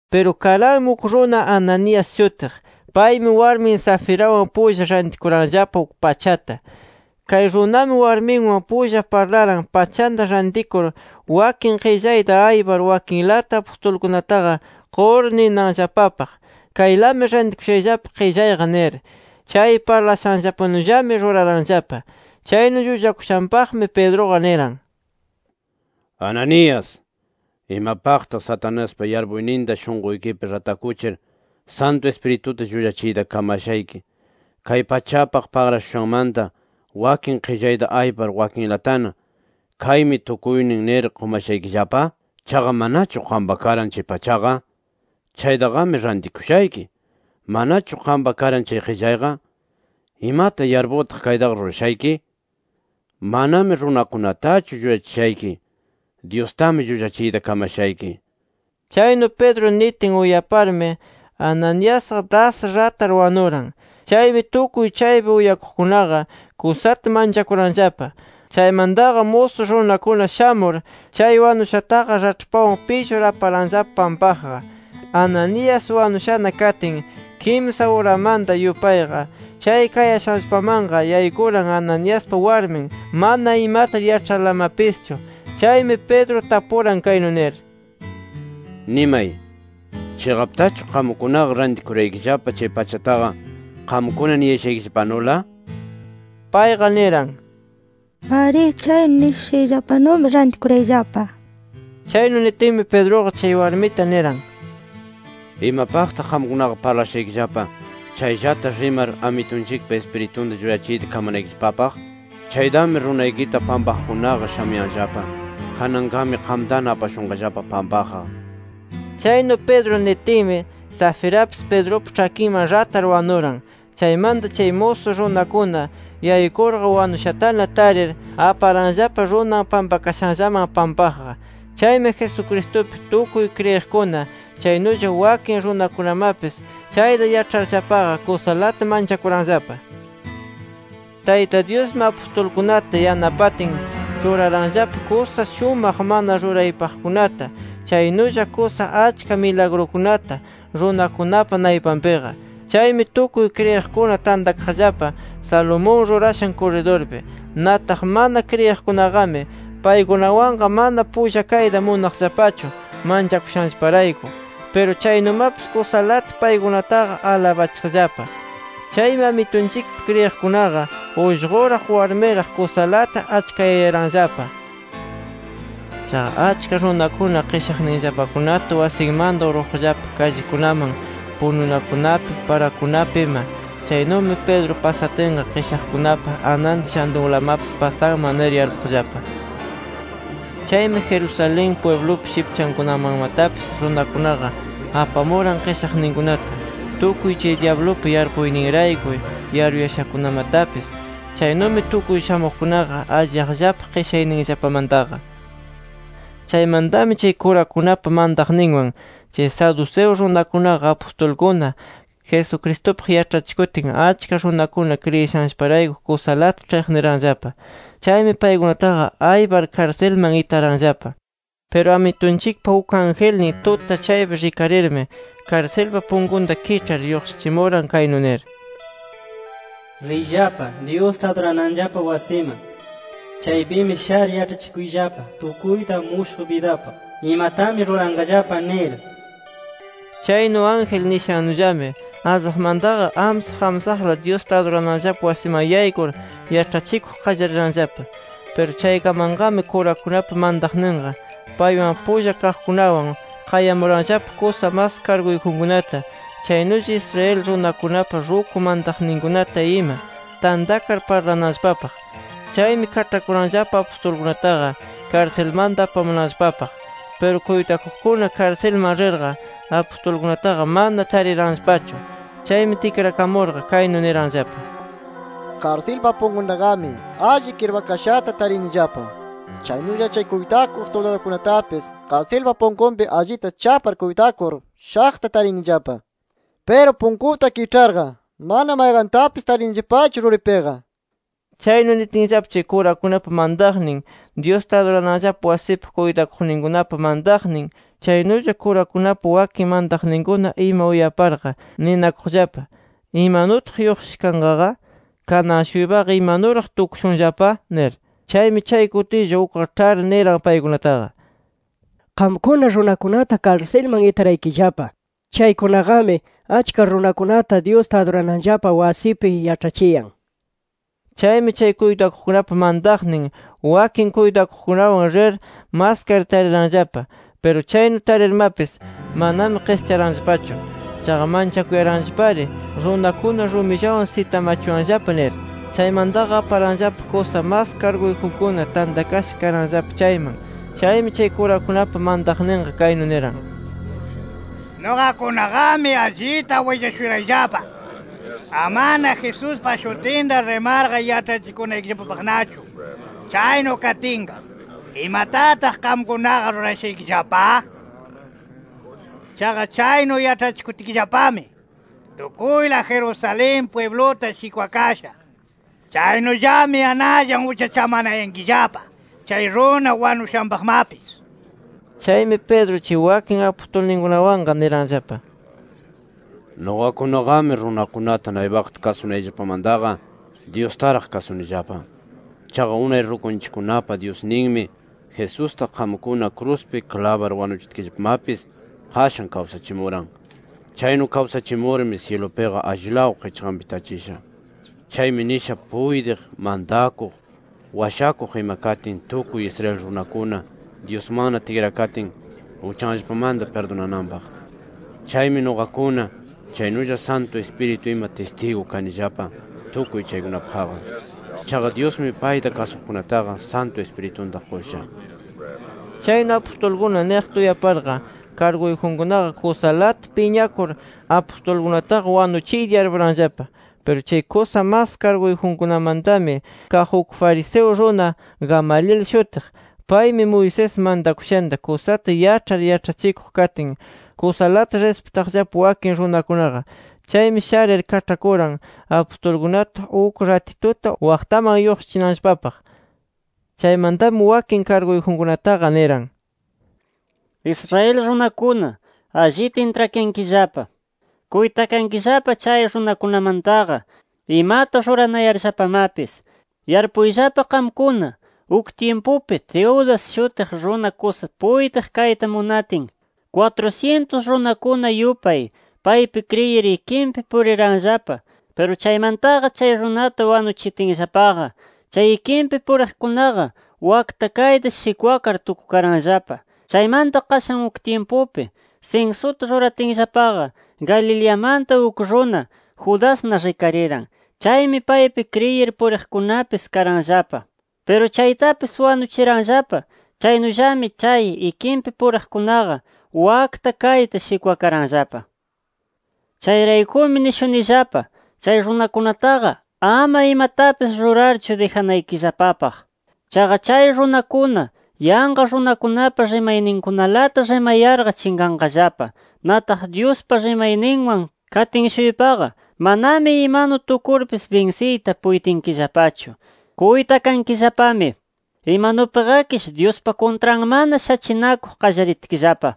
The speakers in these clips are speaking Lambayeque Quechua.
Piru karanmi uk runa Ananías shutiq. Paymi warmin Safirawan pulla rantikuranllapa uk pachata. Kay runami warminwan pulla parlaran pachanta rantikur wakin qillayta aypar wakinlata apustulkunataqa qur ninanllapapaq: “Kaylami rantikushayllapa qillayqa” nir. Chay parlashanllapanullami ruraranllapa. Chaynu llullakushanpaqmi Pedruqa niran: —Ananías ¿imapaqtaq Satanaspa yarpuyninta, shunquykipi ratakuchir Santu Ispirituta llullachiyta kamashayki, chay pachapaq pagrashushanmanta wakin qillayta aypar wakinlatana ‘Kaymi tukuynin’ nir qumashaykillapa? ¿Chaqa manachu qampa karan chay pachaqa? Chaytaqami rantikushayki. ¿Manachu qampa karan chay qillayqa? ¿Imata yarpurtaq kaytaqa rurashayki? Manami runakunatachu llullachishayki. Dyustami llullachiyta kamashayki nir. Chaynu Pedro nitin, uyaparmi Ananiasqa das ratar wanuran. Chaymi tukuy chaypi uyakuqkunaqa kusata manchakuranllapa. Chaymantaqa musu runakuna shamur, chay wanushataqa raĉhpawan pillur aparanllapa pampaqqa. Ananías wanushana katin, kimsa uramanta yupayqa, chay kayashanllapamanqa yaykuran Ananiaspa warmin, mana imata yaĉharlamapischu. Chaymi Pedro tapuran kaynu nir: —Nimay ¿chiqaptachu qamkunaqa rantikuraykillapa chay pachataqa, qamkuna niyashaykillapanula? nir. Payqa niran: —Arí, chaynu nishushayllapanumi rantikurayllapa. Chaynu nitinmi, Pedruqa chay warmita niran: —¿Imapaqtaq qamkunaqa parlashaykillapa chayllata rimar, Amitunchikpa Ispiritunta llullachiyta kamanaykillapapaq? Chaytami runaykita pampaqkunaqa shamuyanllapa. Kananqami qamtana apashunqallapa pampaqqa nir. Chaynu Pedro nitinmi Safirapis, Pedrupa ĉhakinman ratar wanuran. Chaymanta chay musu runakuna yaykurqa, wanushatana tarir, aparanllapa runan pampakashanllaman pampaqqa. Chaymi Jesucristupi tukuy kriyiqkuna, chaynulla wakin runakunamapis, chayta yaĉharllapaqa kusalata manchakuranllapa. Tayta Dyusmi, apustulkunata yanapatin ruraranllapa kusa shumaq mana ruraypaqkunata chaynulla kusa achka milagrukunata runakunapa naypanpiqa. Chaymi tukuy kriyiqkuna tantakaqllapa Salomón rurashan kurridurpi. Nataq mana kriyiqkunaqami paykunawanqa mana pulla kayta munaqllapachu manchakushanllaparayku. Piru chaynumapis kusalata paykunataqa alabachiqllapa. Chaymi Amitunchikpi kriyiqkunaqa ullquraq, warmiraq kusalata achkayayaranllapa. Chaqa, achka runakuna qishaqninllapakunata wasinmanta urquqllapa kallikunaman pununakunapi, parakunapi ima. Chaynumi Pedro pasatinqa, qishaqkunapa ananta llantunlamapis pasanman nir yarpuqllapa. Chaymi Jerusalén pwiblupa shipchankunamanmatapis, runakunaqa apamuran qishaqninkunata, tukuy chay dyablupa yarpuyninrayku yaruyashakunamatapis. Chaynumi tukuy shamuqkunaqa alliyaqllapa qishayninllapamantaqa. Chaymantami chay kurakunapa mantaqninwan, chay saduceo runakunaqa apustulkuna Jesucristupaq yaĉhachikutin achka runakuna kriyishanllaparayku kusalata ĉhiqniranllapa. Chaymi paykunataqa aypar, karsilman itaranllapa. Piru Amitunchikpa uk angelnin tuta chaypi rikarirmi, karsilpa punkunta kiĉhar lluqshichimuran kaynu nir: “Riyllapa, Dyusta adurananllapa wasiman. Chaypimi shar yaĉhachikuyllapa tukuyta mushuq bidapaq, imatami ruranqallapa nir”. Chaynu ángel nishannullami, allaqmantaqa amsaq amsaqla Dyusta adurananllapa wasiman yaykur, yaĉhachikuq qallariranllapa. Piru chaykamanqami, kurakunapa mantaqninqa, paywan pulla kaqkunawan, qayamuranllapa kusa mas karguyjunkunata, chaynulla Israel runakunapa ruku mantaqninkunata ima, tantakar parlananllapapaq. Chaymi kaĉhakuranllapa apustulkunataqa karsilmanta apamunanllapapaq. Piru kuytakuqkuna karsilman rirqa, apustulkunataqa mana tariranllapachu. Chaymi tikrakamurqa kaynu niranllapa: —Karsilpa punkuntaqami alli kirpakashata tarinillapa. Chaynulla chay kuytakuq suldadukunatapis, karsilpa punkunpi allita chapar kuytakur shaqta tarinillapa. Piru punkuta kiĉharqa, mana mayqantapis tarinillapachu ruripiqa nir. Chaynu nitinllapa, chay kurakunapa mantaqnin, Dyusta adurananllapa wasipa kuytakuqninkunapa mantaqnin, chaynulla kurakunapa wakin mantaqninkuna ima uyaparqa, ninakuqllapa: “¿Imanutaq lluqshisha kanqaqa? ¿Kanan-shuypaqa imanuraq tukushunllapa?” nir. Chaymi chay kutilla, ukqa ĉhar niran paykunataqa: —Qamkuna runakunata karsilman itaraykillapa, chaykunaqami achka runakunata Dyusta adurananllapa wasipi yaĉhachiyan nir. Chaymi chay kuytakuqkunapa mantaqnin wakin kuytakuqkunawan rir maskar tariranllapa. Piru chaynu tarirmapis, manami qischaranllapachu. Chaqa manchakuyaranllapari “Runakuna rumillawan sitamachuwanllapa” nir. Chaymantaqa aparanllapa kusa mas karguyjunkuna tantakasha karanllapa chayman. Chaymi chay kurakunapa mantaqninqa kaynu niran: —Nuqakunaqami allita willashurayllapa, amana Jesuspa shutinta rimarqa yaĉhachikunaykillapapaqnachu. Chaynu katinqa ¿imatataq qamkunaqa rurashaykillapa? Chaqa chaynu yaĉhachikutkillapami, tukuyla Jerusalén pwibluta shikwakasha. Chaynullami anallan uchachamanayankillapa chay runa wanushanpaqmapis nir. Chaymi Pedro chay wakin apustulkunawanqa niranllapa: —Nuqakunaqami runakunata naypaqta kasunayllapamantaqa, Dyustaraq kasunillapa. Chaqa unay rukunchikkunapa Dyusninmi, Jesusta qamkuna kruspi klabar wanuchitkillapamapis qashan kawsachimuran. Chaynu kawsachimurmi syilupiqa allilaw qichqanpi tachisha. Chaymi nisha puytiq Mantakuq, Washakuq ima katin tukuy Israel runakuna Dyusmanna tikrakatin, uchanllapamanta pirdunananpaq. Chaymi nuqakuna, chaynulla Santu Ispiritu ima tistigu kanillapa tukuy chaykunapaqqa. Chaqa Dyusmi payta kasuqkunataqa Santu Ispiritunta qusha nir. Chaynu apustulkuna niqta uyaparqa, karguyjunkunaqa kusalata piñakur, apustulkunataqa wanuchiyta yarpuranllapa. Piru chay kusa mas karguyjunkunamantami kaq uk fariseo runa Gamaliel shutiq. Paymi Moisés mantakushanta kusata yaĉhar yaĉhachikuq katin, kusalata rispitaqllapa wakin runakunaqa. Chaymi sharir, kaĉhakuran apustulkunata uk ratituta waqtaman lluqshichinanllapapaq. Chaymantami wakin karguyjunkunataqa niran: —Israel runakuna, allita intrakankillapa. Kuytakankillapa chay runakunamantaqa imata ruranayarllapamapis. Yarpuyllapa qamkuna. Uk tyimpupi Teudas shutiq runa kusa puytiq kayta munatin, kwatru-syintus runakuna yupay paypi kriyir ikinpi puriranllapa. Piru chaymantaqa chay runata wanuchitinllapaqa chay ikinpi puriqkunaqa wakta kayta shikwakar tukukaranllapa. Chaymanta qashan uk tyimpupi, sinsuta ruratinllapaqa, Galileamanta uk runa Judasna rikariran. Chaymi paypi kriyir puriqkunapis karanllapa. Piru chaytapis wanuchiranllapa. Chaynullami, chay ikinpi puriqkunaqa wakta kayta shikwakaranllapa. “Chayraykumi nishunillapa, chay runakunataqa ama imatapis rurarchu, dijanaykillapapaq. Chaqa chay runakuna yanqa runakunapa rimayninkunalata rimayarqa, chinqanqallapa. Nataq Dyuspa rimayninwan katin-shuypaqa manami imanu tukurpis binsiyta puytinkillapachu. ¡Kuytakankillapami! ¡Imanupiqakish Dyuspa kuntranmana, shachinakuq qallaritkillapa!” nir.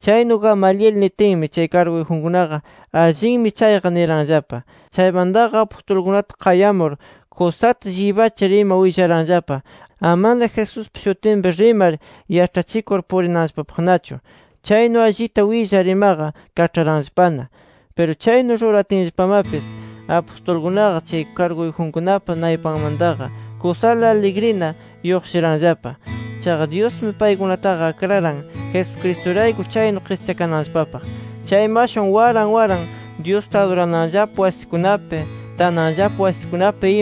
Chaynu Gamaliel nitinmi, chay karguyjunkunaqa “Allinmi chayqa” niranllapa. Chaymantaqa apustulkunata qayamur kusata llibachir ima, willaranllapa, amana Jesuspa shutinpi rimar yaĉhachikur purinanllapapaqnachu. Chaynu allita willar imaqa, kaĉharanllapana. Piru chaynu ruratinllapamapis, apustulkunaqa chay karguyjunkunapa naypanmantaqa kusala aligrina lluqshiranllapa. Chaqa Dyusmi paykunataqa akraran Jesucristurayku chaynu qischakananllapapaq. Chaymi ashwan waran waran Dyusta aduranllapa wasikunapi, tananllapa wasikunapi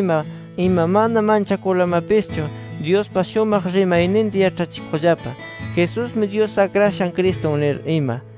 ima mana manchakurlamapischu Dyuspa shumaq rimayninta yaĉhachikuqllapa, Jesusmi Dyus Akrashan Cristun nir ima.